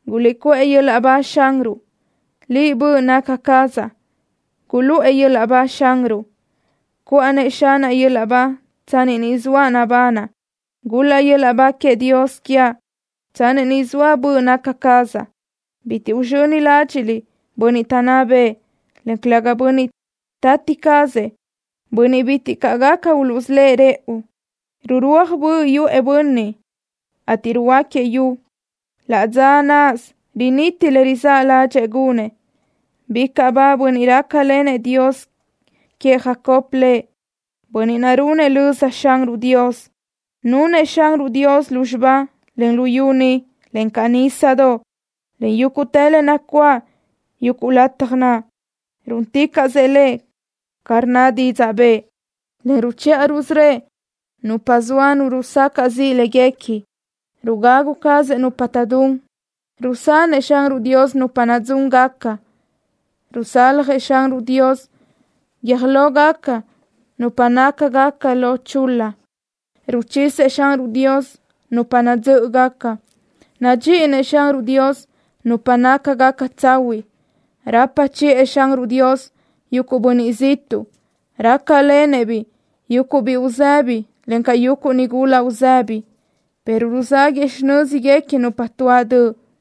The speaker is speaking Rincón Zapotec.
¡Guliʼcuʼë yöl-laʼ ba Xanruʼ! ¡Liʼ, böʼ naca cazaʼ, guluʼë yöl-laʼ ba Xanruʼ! ¡Cuʼa-nëʼ Xanaʼ yöl-laʼ ba tsanni ni zoaʼ nabanaʼ! ¡Gul-laʼ yöl-laʼ ba queëʼ Dios quiaʼ tsanni ni zoa böʼ naca cazaʼ! Bitiʼ uzxöni ládxiʼliʼ bönniʼ taʼnná bëʼë, en calëga bönniʼ tati cazëʼ, bönniʼ bitiʼ caʼ gaca uluʼsölë́ʼ rëʼu. Rurúaj böʼ yuʼë nu bönniʼ, ateʼ ruhuöáquiëʼ yu. Laʼ dza náʼasö riniti le rizáʼ ládxëʼë gunëʼ. Bicaʼ ba bönniʼ rácalenëʼ Dios queëʼ Jacob lëʼ, bönniʼ naʼ runëʼ löza Xanruʼ Dios. Nunëʼ Xanruʼ Dios lúzxiba, en luyú ni, encaʼ nísadoʼ, en yúguʼtë le nacuáʼ yuguʼ lataj naʼ. Rúnticaʼsëʼ Lëʼ ca rnna didzaʼ bëʼë, en ruchiʼa rusörö́ëʼ nupa zoa nu rusacaʼ ziʼ léguequi. Rugagu cazëʼ nupa taʼdún. Rusanëʼ Xanruʼ Dios nupa nadzúngaca. Rusaljëʼ Xanruʼ Dios guiö́j lógaca nupa nácagaca lo chul-la. Ruchisëʼ Xanruʼ Dios nupa nadzö́ʼögaca. Nadxíʼinëʼ Xanruʼ Dios nupa nácagaca tsahuiʼ. Rapa chiʼë Xanruʼ Dios yuguʼ bönniʼ ziʼtuʼ. Rácalenëʼ-biʼ yuguʼ biʼi uzëbi, encaʼ yuguʼ nigula uzëbi, pero ruzaguëʼ xinö́zguequi nupa tuáʼ döʼ.